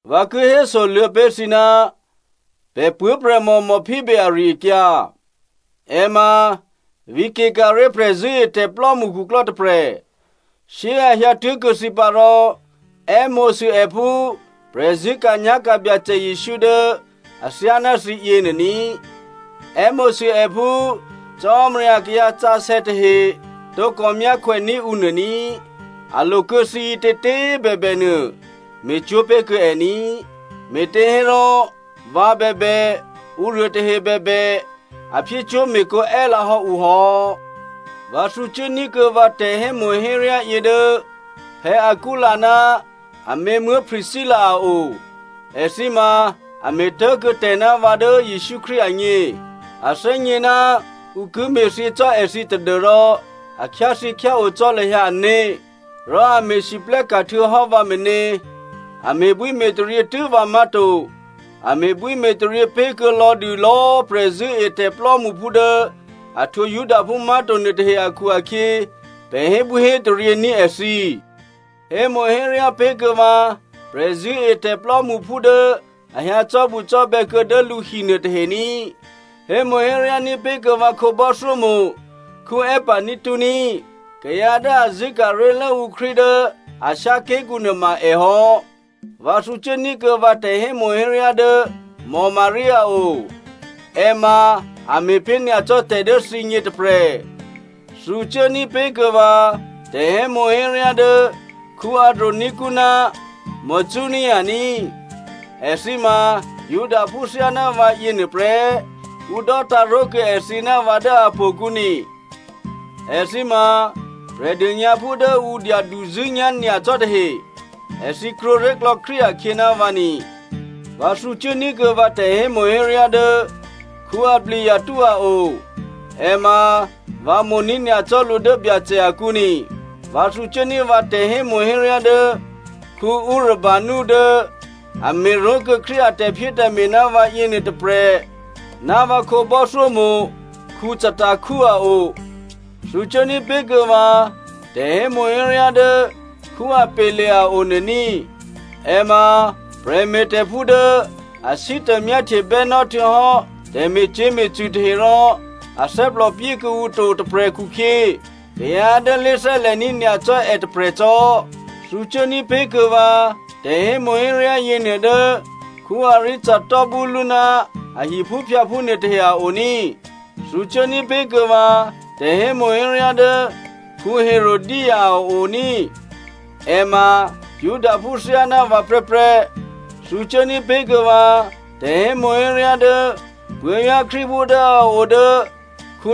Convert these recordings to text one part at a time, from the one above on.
Vǎ ki hésoluô̌ pé̤ thǐ ná pè̤ puố̤prè̤mò Phoebe ari-akyǎ. È ma vǐ̤ Cenchrea prè̤zṳ̂́etè̤plò́mṳ khuklò́ tôprè̤. Shyé꤮ a hyǎtuố̤kuô̌ thǐ pǎ rò è́mo̤sû è phú prè̤zṳ̂́ka̤nyá̤ka̤ Byacè Jesǔ dố athyáná thǐ yěnuô ní꤮. È́mo̤sû è phú Cò́marya akayǎ sǎsè̌ tahe tǒkò myákhwèní̤ ǔ nuô ní꤮. A lo kuô̌ thǐ ǐtětě꤮ bèbènuô me̤cwó̤ pé̤kuô̌ è ní꤮, me̤těhérò vǎ bèbè, ǔruô tahe bèbè, a me̤cwó̤me̤kǒ è́lǎhò́ ǔ hò́. Vǎ thǔcuố ní̤kuô̌ vǎ tè̤hémo̤héryá yě dố Aquila ná amě Priscilla a o. Èthǐ ma a me̤tố̤kuô̌ tè̤ ná vǎ dố Jesǔ Krístu agně. A thè́gně ná ǔ ki me̤thyě cò́ èthǐ tadû́rò a khyáthyěkhyáo cò́ lahyǎ ané̤, rò a me̤lwóhteka̤ htuô̌hò́ vǎ meně. A me̤bwíme̤taryě tû́ vǎ má̤to, a me̤bwíme̤taryě pé̤kuô̌ lò̌dû lò̌꤮ prè̤zṳ̂́etè̤ plò́mṳphú dố a htwǒ Judaphú má̤to nuôtahe akhu-akhyě, pè̤ hébwíhétaryě ní̤ èthǐ. Hémo̤héryá pé̤kuô̌ vǎ prè̤zṳ̂́etè̤ plò́mṳphú dố a hyǎ cò́bucò́bè̌ kuô̌ dố lǔ hi nuôtahe ní꤮. Hémo̤héryá ní̤pé̤ kuô̌ vǎ khǒbò́thyómo̤ Epaeneto ní꤮. Kayǎ dố a zṳ̂́ka̤ ré̤lố ǔ Krístu dố Asia ké̤kǔ nuôma è hò́. Vǎ thǔcuố ní̤kuô̌ vǎ tè̤hémo̤héryá dố Maria a o. È ma a me̤pé̤ nyacò́ tè̤ dố thǐgně tôprè̤. Thǔ cuố ní̤pé̤ kuô̌ vǎ tè̤hémo̤héryá dố Andronico ná Junia ní꤮. Èthǐ ma Judaphú thyáná vǎ yěnuô prè́. Ǔ dò́tǎ̤ ró̤kuô̌ èthǐ ná vǎ dố htò̌kǔ ni. Èthǐ ma Prè̤dônyǎphú dố ǔ dyaduzṳ̂́nyá̤ nyacò́ tahe. Èthǐ krwǒré̤klò̌ Krístu akhyě ná vǎ ni. Vǎ thǔcuố ní̤kuô̌ vǎ tè̤hémo̤héryá dố Ampliato a o, è ma vǎ mo̤ní̤ nyacò́ lǔ dố Byacè akǔ ní꤮. Vǎ thǔcuốní̤ vǎ tè̤hémo̤héryá dố Urbano dố a me̤ ró̤kuô̌ Krístu a tè̤phyétè̤me̤ ná vǎ yěnuô tôprè̤ ná vǎ khǒbò́thyómo̤ Staky a o. Thǔcuốní̤ pé̤kuô̌ vǎ tè̤hémo̤héryá dố Apelle a o nuô ní꤮. È ma prè̤me̤tè̤phú dố a sítô myáhtyebè́ nò́ htuô̌hò́ tè̤me̤cyě̤me̤cṳ̂ tahe rò a thè́plòpyé kuô̌ǔ to tôprè̤ khukhyě kayǎ dố lé̤thè́lè̤ní̤ nyacò́ è tôprè̤cò́. Thǔcuốní̤ pé̤kuô̌ vǎ tè̤hémo̤héryá yěnuô dố Aristobulo ná a hiphúphyǎphú nuôtahe a o ní꤮. Thǔcuốní̤ pé̤kuô̌ vǎ tè̤hémo̤héryá dố Herodio a o ní꤮. È ma Judaphú thyáná vǎ prè́prè́. Thǔcuốní̤ pé̤ kuô̌ vǎ tè̤hémo̤héryá dố puố̤vyá̤ Krístuphú dố a o dố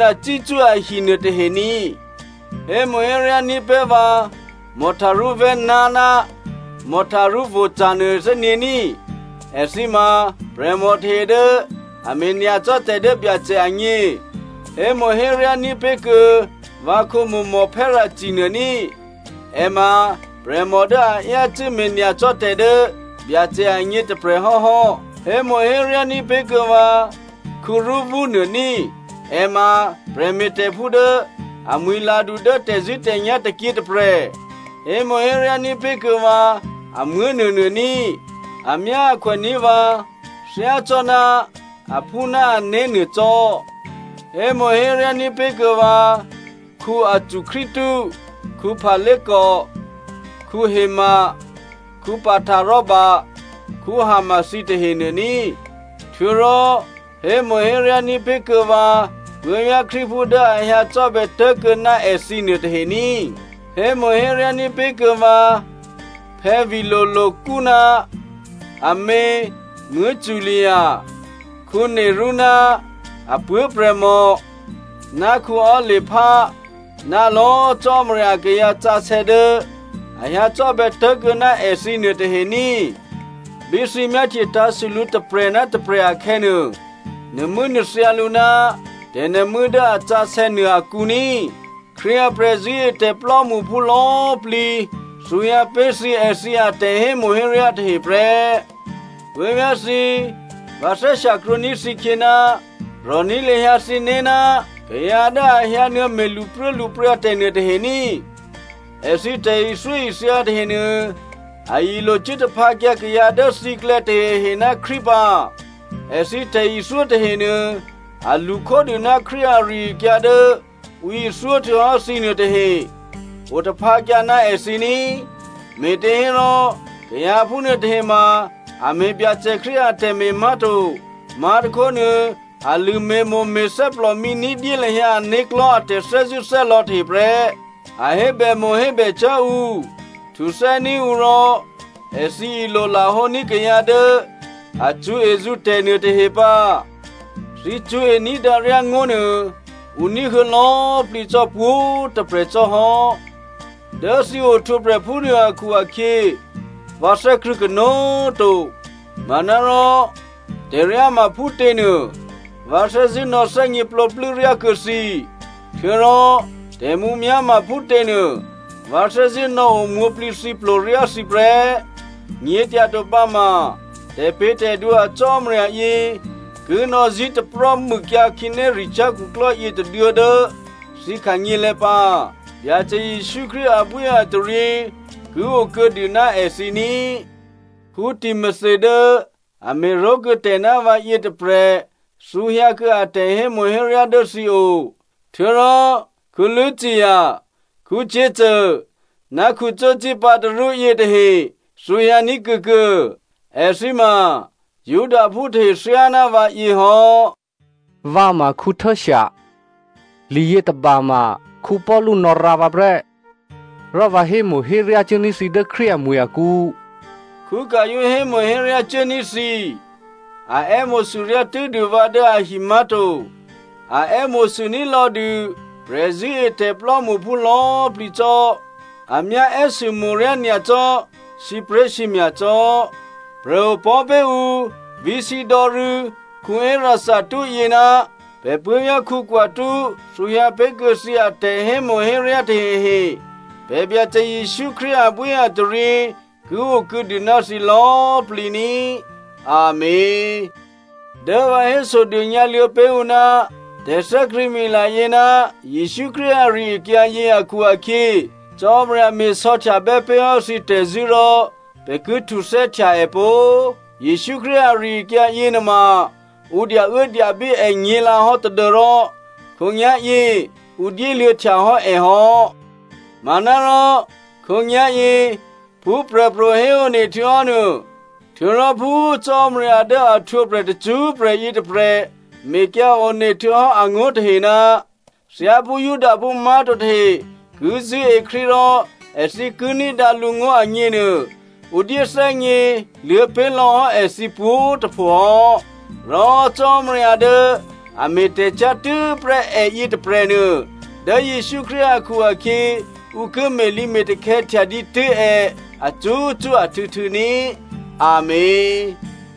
Narcisso ahi nuôtahe ní꤮. Hémo̤héryá ní̤pé̤ vǎ Tryphaena ná Tryphosa nuôthè́nyě̤ ní꤮. Èthǐ ma prè̤mò tahe dố a me̤ nyacò́ tè̤ dố Byacè agně. Hémo̤héryá ní̤pé̤ kuô̌ vǎkhǒmo̤ Persi nuô ní꤮. È ma prè̤mò dố a yácû́ me̤nyacò́tè̤ dố Byacè agně tôprè̤ hò́hò́. Hémo̤héryá ní̤pé̤ kuô̌ vǎ Rufo nuô ní꤮. È ma prè̤me̤tè̤phú dố amwi̤ladu dố tè̤zṳ̂́tè̤nyá̤ tôkyě tôprè̤. Hémo̤héryá ní̤pé̤ kuô̌ vǎ amuố̤ nuônuô ní꤮. Amyáakhwè ní̤ vǎ thyácò́ná aphú ná ané̤ nuô cò́. Hémo̤héryá ní̤pé̤ kuô̌ vǎ Asycrito, Phlego, Herme, Pataroba, Herma thǐ tahenuô ní꤮. Htuô̌rò hémo̤héryá ní̤pé̤ kuô̌ vǎ puố̤vyá̤ Krístuphú dố a hyǎ cò́bè̌ tuố̤kuô̌ ná èthǐ nuôtahe ní꤮. Hémo̤héryá ní̤pé̤kuô̌ vǎ Philologo ná amě Julia, Nereo ná apuố̤prè̤mò, ná Olympa ná lò̌꤮ Cò́marya akayǎ sǎsè̌ dố a hyǎ cò́bè̌ tố̤kuô̌ ná èthǐ nuôtahe ní꤮. Bí thǐ myáhtye tǎ̤sû lǔ tôprè̤ ná tôprè̤ akhè̌nuô, nuô̤mû́nuô̤thyǎ lǔ ná tè̤nuô̤mû́ dố a sǎsè̌ nuô akǔ ní꤮. Krístu a prè̤zṳ̂́etè̤ plò́mṳphú lò̌꤮ plǐ thǔhyǎ pé̤ thǐ èthǐ atè̤hémo̤héryá tahe prè́. Puố̤vyá̤ thǐ, vǎ thè́shyakrwǒní̤ thǐkhyě, rò̤ní̤ lahyǎ thǐné̤ ná kayǎ dố a hyǎnuô̌me̤ lṳpruốlṳpryǎ tè̤ nuôtahe ní꤮. Èthǐ tè̤ithyóithya tahenuô a ilo cuố taphǎkyǎ kayǎ dố thǐklè̌ tahehe ná Krístu pǎ. Èthǐ tè̤ithyó tahenuô a lṳ khódû ná Krístu ari-akyǎ dố ǔ ithyó htuô̌hò́ thǐ nuôtahe. Otaphǎkyǎ ná èthǐ ní꤮. Me̤těhérò kayǎ phúnuô tahe ma a me̤ Byacè Krístu atè̤me̤ má̤to. Má̤tôkhónuô, a lṳ̂me̤mo̤ me̤thè́plòmǐ ní̤dyé lahyǎ ané̤klò̤́ a tè̤thè́zṳ̂́thè́lò̌ tahe prè́. A hébèmo̤ hébècyá̤ ǔ, htuthè́ní̤ ǔ rò èthǐ ilolahǒní̤ kayǎ dố a cṳ̌ezǔ tè̤nuôtahe pǎ. Thǐ cṳ̌e ní̤dǎryá ngó̤nuô, ǔ ní̤huô̌ lò̌꤮ plǐ cò́ pwǒ̤꤮ tôprè̤ cò́ hò́. Dố thǐ ohtwǒprè̤ phúnuô akhu-akhyě vǎ thè́krṳ̂̌ kanó̤꤮ to. Manárò tè̤ryá ma phútě nuô, vǎ thè́zṳ̂́ nò̌thè́gněplǒplû́ ryá kuô̌ thǐ. Htuô̌rò tè̤mǔmyá̤ ma phútěnuô, vǎ thè́zṳ̂́ nò̌o mwǒ̤plǐthǐplo ryá thǐ prè́. Nyě̤tyato pǎma tè̤pě̤tè̤dwǒ a Cò́marya yě ki nò̌zí̤taprò́ mûkyǎ khǐnéricyá̤ khuklò́ yětôduô̌ dố thǐ khanyělè̤̌ pǎ. Byacè Jesǔ Krístu abwíataryě ki okuô̌dû ná èthǐ ní꤮. Timothy dố a me̤ró̤kuô̌ tè̤ ná vǎ yětôprè̤ thǔhyǎ kuô̌ a tè̤hémo̤héryá dố thǐ o. Htuô̌rò Lucio, Jason ná Sosipater yětahe thǔhyǎní̤ kuô̌kuô̌. Èthǐ ma Judaphú tahe thyáná vǎyě hò́. Vǎ ma Tertio. Liyětôba ma Paulu nò̌rǎ vǎ prè́. Rò vǎ hémo̤héryá cuốní̤ thǐ dố Krístu amwi̤ akǔ. Gaio hémo̤héryá cuốní̤ thǐ. A è́mo̤sûryá tû́dû vǎ dố ahi má̤to, a è́mo̤sûní̤ lò̌dû prè̤zṳ̂́etè̤ plò́mṳphú lò̌꤮ plǐ cò́. A myá è́sûmo̤ryá nyacò́ sǐpré̤sǐmya̤ cò́. Prè̤opò̤́ pé̤ǔ vǐ̤shyědò̌ rû̌ Erasto yě ná pè̤ puố̤vyá̤ Quarto thǔhyǎ pé̤kuô̌ thǐ atè̤hémo̤héryá tahehe. Pè̤ Byacè Jesǔ Krístu abwíataryě ki o kuô̌dû ná thǐ lò̌꤮ plǐ ní꤮. Amèn. Dố vǎ hésodônyǎ luô̌ pé̤ ǔ ná tè̤thè́krṳ̂̌mila yě ná Jesǔ Krístu ari-akyǎyě akhu-akhyě, Cò́marya me̤sò̌htyabè́ pé̤ hò́ thǐ tè̤zṳ̂́ rò pè̤ ki htuthè́htya è pó꤮. Jesǔ Krístu ari-akyǎ yěnuôma, ǔ dyauốdyabí è nyě̤lǎhò́ tadû́rò khǒnyá̤yě ǔ dyéluô̌ htyahò́ è hò́. Manárò khǒnyá̤yě phú prè̤pro̤ héone htuô̌hò́ nuô, htuô̌rò phú Cò́marya dố a htwǒprè̤ tacṳ́prè̤ yětôprè̤ mekyǎ one htuô̌hò́ angó̤ tahe, thyáphú Judaphú má̤to tahe ki zṳ̂́e Krístu rò èthǐ ki ní̤dǎ lǔngó̤ agněnuô, ǔ dyéthè́gně luô̌pé̤ lò̌hò́ èthǐ pwǒ̤꤮ tôpho hò́. Rò Cò́marya dố a me̤tè̤cyá̤ tû́prè́ è yětôprè̤nuô, dố Jesǔ Krístu akhu-akhyě ǔ ki me̤lǐme̤takhè̌ htya dǐtû́ è acṳ́cṳ́ ahtû̌htû̌ ní꤮. Amèn.